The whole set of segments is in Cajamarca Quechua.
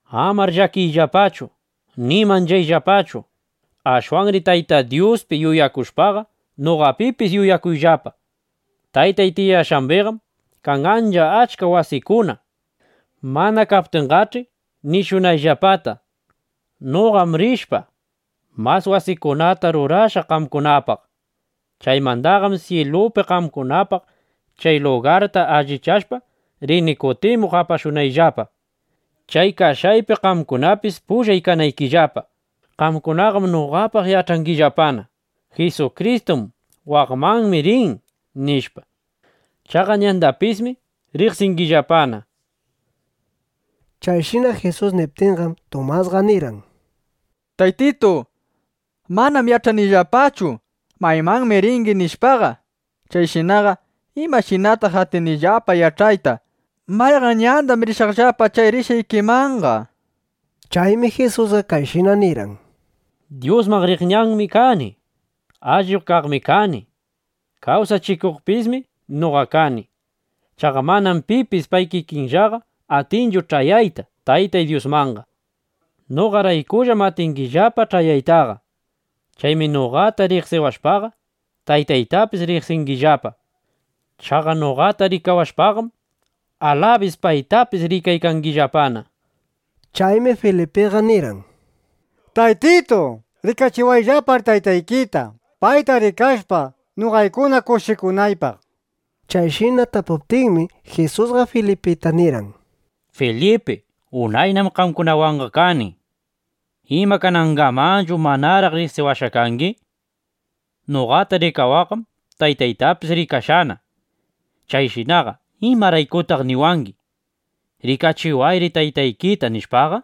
’Amar llakiyllapachu ni manchayllapachu. Ashwanri Tayta Dyuspi yuyakushpaqa, noqapipis yuyakuyllapa. Taytay tiyashqambiqam kan ancha achka wasikuna. Mana kaptinqach'i, nishunayllapata. Noqam rishpa, mas wasikunata rurashaq qamkunapaq. Chaymandaqam syilupi qamkunapaq chay lugarta allichashpa, rini kutimuq apashunayllapa, chay kashqaypi qamkunapis pullay kanaykillapa. Qamkunaqam noqapaq yach'angillapana: Jisukristum waqmanmi rin, nishpa. Chaqa ñandapismi riqsingillapana. Chayshina Jisus niptinqam, Tumasqa nirqan: —Taytitu, manam yach'anillapachu: Maymanmi ringi, nishpaqa. Chayshinaqa ¿imashinataq atinillapa yach'ayta: Mayqan ñandam rishaqllapa chay rishqaykimanqa? nishpa. Chaymi Jisusqa kayshina nirqan: —Dyusman riq ñanmi kani. Allip kaqmi kani. Kawsachikuqpismi noqa kani. Chaqa manam pipis pay kikinllaqa atinchu ch'ayayta Tayta Dyusmanqa. Noqaraykullam atingillapa ch'ayaytaqa. Chaymi noqata riqsiwashpaqa, Taytaytapis riqsingillapa. Chaqa noqata rikawashpaqam, alabis paytapis rikaykangillapana, nishpa. Chaymi Filipiqa nirqan: —Taytitu, rikachiwayllapar Taytaykita, payta rikashpa, noqaykuna kushikunaypaq, nishpa. Chayshina tapuptinmi, Jisusqa Filipita nirqan: —¡Filipi, unaynam qamkunawanqa kani! ¿Ima, kanangamanchu manaraq riqsiwashqa kangi? Noqata rikawaqqam Taytaytapis rikashqana. Chayshinaqa ¿imaraykutaq niwangi: “Rikachiwayri Taytaykita”, nishpaqa?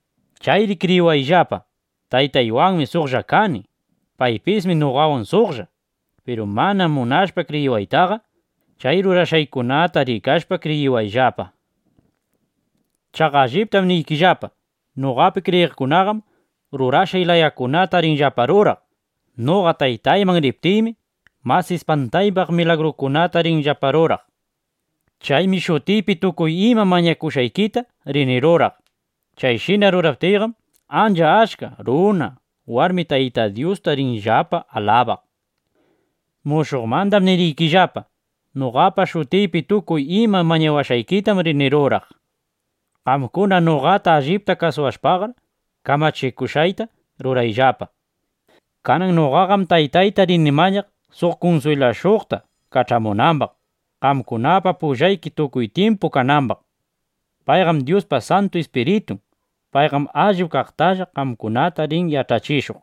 Chayri kriyiwayllapa, Taytaywanmi suqlla kani. Paypismi noqawan suqlla. Piru mana munashpa kriyiwaytaqa, chay rurashqaykunata rikashpa, kriyiwayllapa. Chaqa alliptam niykillapa, noqapi kriyiqkunaqam rurashqay layakunata rinllapa ruraq. Noqa Taytayman riptiymi, mas ispantaypaq milagrukunata rinllapa ruraq. Chaymi shutiypi tukuy ima mañawashqaykita rini ruraq. Chayshina ruraptiyqam, ancha achka runa, warmi Tayta Dyusta rinllapa alabaq. Mushuqmanda niriykillapa: Noqapa shutiypi tukuy ima mañawashqaykitam rini ruraq, nishpa. Qamkuna noqata allipta kuyawashpaqar, kamachikushqayta rurayllapa. Kanan noqaqam Taytayta rini mañaq, suq kunswilashuqta kach'amunambaq, qamkunapa pullayki tukuy tyimpu kanambaq. Payqam Dyuspa Santu Ispiritun. Payqam allip kaqtalla qamkunata rin yach'achishuq.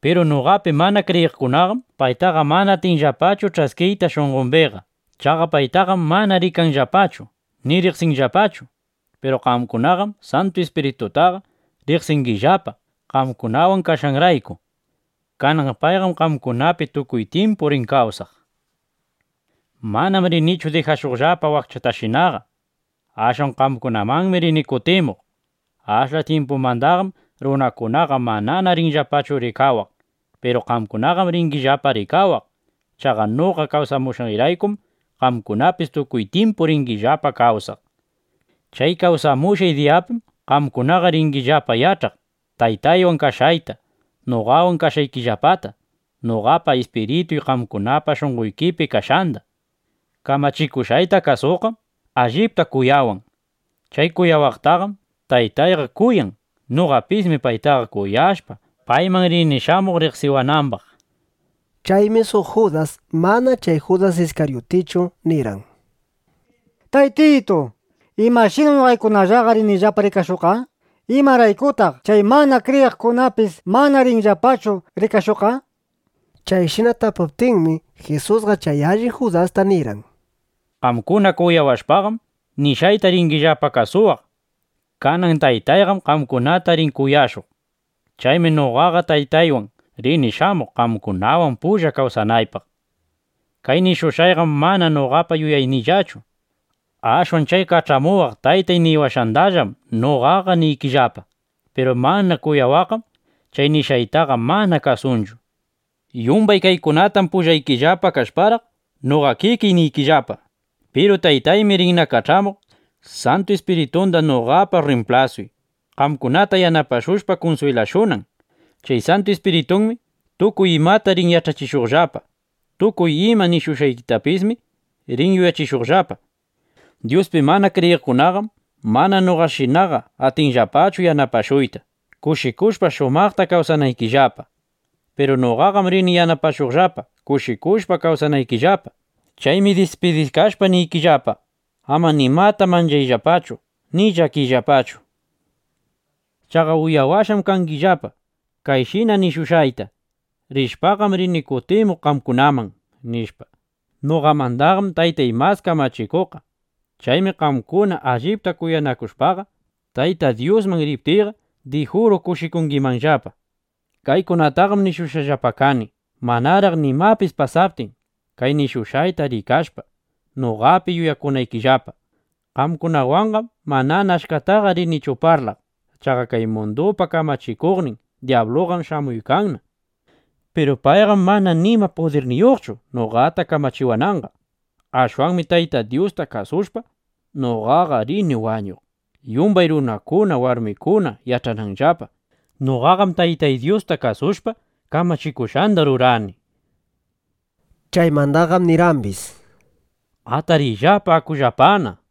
Piru noqapi mana kriyiqkunaqam paytaqa mana atinllapachu ch'askiyta shunqombiqa. Chaqa paytaqam mana rikanllapachu, ni riqsinllapachu. Piru qamkunaqam Santu Ispiritutaqa riqsingillapa, qamkunawan kashqanrayku. Kanan payqam qamkunapi tukuy tyimpu rin kawsaq. Manam rinichu dijashuqllapa wakchatashinaqa. Ashwan qamkunamanmi rini kutimuq. Ashla tyimpumandaqam runakunaqa manana rinllapachu rikawaq. Piru qamkunaqam ringillapa rikariwaq. Chaqa noqa kawsamushqayraykum qamkunapis tukuy tyimpu ringillapa kawsaq. Chay kawsamushqay diyapim qamkunaqa ringillapa yach'aq Taytaywan kashqayta, noqawan kashqaykillapata, noqapa ispirituy qamkunapa shunqoykipi kashqanda. Kamachikushqayta kasuqqam allipta kuyawan. Chay kuyawaqtaqam Taytayqa kuyan. Noqapismi paytaqa kuyashpa, payman rini shamuq riqsiwanambaq. Chaymi suq Judas (mana chay Judas Iskaryutichu), nirqan: —Taytitu, ¿imashinam noqaykunallaqa rinillapa rikashuqqa? ¿Imaraykutaq chay mana kriyiqkunapis mana rinllapachu rikashuqqa? nishpa. Chayshina tapuptinmi, Jisusqa chay allin Judasta nirqan: —Qamkuna kuyawashpaqam, nishqayta ringillapa kasuwaq. Kanan Taytayqam qamkunata rin kuyashuq. Chaymi noqaqa Taytaywan rini shamuq, qamkunawan pulla kawsanaypaq. Kay nishushqayqam mana noqapa yuyayniyllachu. Ashwan chay kach'amuwaq Taytay niwashqandallam noqaqa niykillapa. Piru mana kuyawaqqam chay nishqaytaqa mana kasunchu. ’Yumbay kaykunatam pullaykillapa kashparaq, noqa kikiy niykillapa. Piru Taytaymi rinna kach'amuq Santu Ispiritunda noqapa rrimplasuy, qamkunata yanapashushpa kunswilashunan. Chay Santu Ispiritunmi tukuy imata rin yach'achishuqllapa. Tukuy ima nishushqaytapismi rin yuyachishuqllapa. ’Dyuspi mana kriyiqkunaqam mana noqashinaqa atinllapachu yanapashuyta, kushikushpa shumaqta kawsanaykillapa. Piru noqaqam rini yanapashuqllapa, kushikushpa kawsanaykillapa. Chaymi dispidikashpa niykillapa, ama nimata manchayllapachu ni llakiyllapachu. Chaqa uyawashqam kangillapa, kayshina nishushqayta: “Rishpaqam rini kutimuq qamkunaman”, nishpa. Noqamandaqam Taytay mas kamachikuqqa. Chaymi qamkuna allipta kuyawashpaqa, Tayta Dyusman riptiyqa, dijuru kushikungimanllapa. Kaykunataqam nishushqallapa kani, manaraq nimapis pasaptin, kay nishushqayta rikashpa, noqapi yuyakunaykillapa. ’Qamkunawanqam manana achkataqa rinichu parlaq. Chaqa kay mundupa kamachikuqnin dyabluqam shamuykanna. Piru payqam mana nima pudirniyuqchu, noqata kamachiwananqa. Ashwanmi Tayta Dyusta kasushpa, noqaqa rini wañuq, yumbay runakuna, warmikuna yach'ananllapa: Jisukristum Tayta Dyusta kuyashpa, kamachishqanda ruran, nishpa. Chaymandaqam nirqambis: —Atariyllapa. Akullapana, nishpa.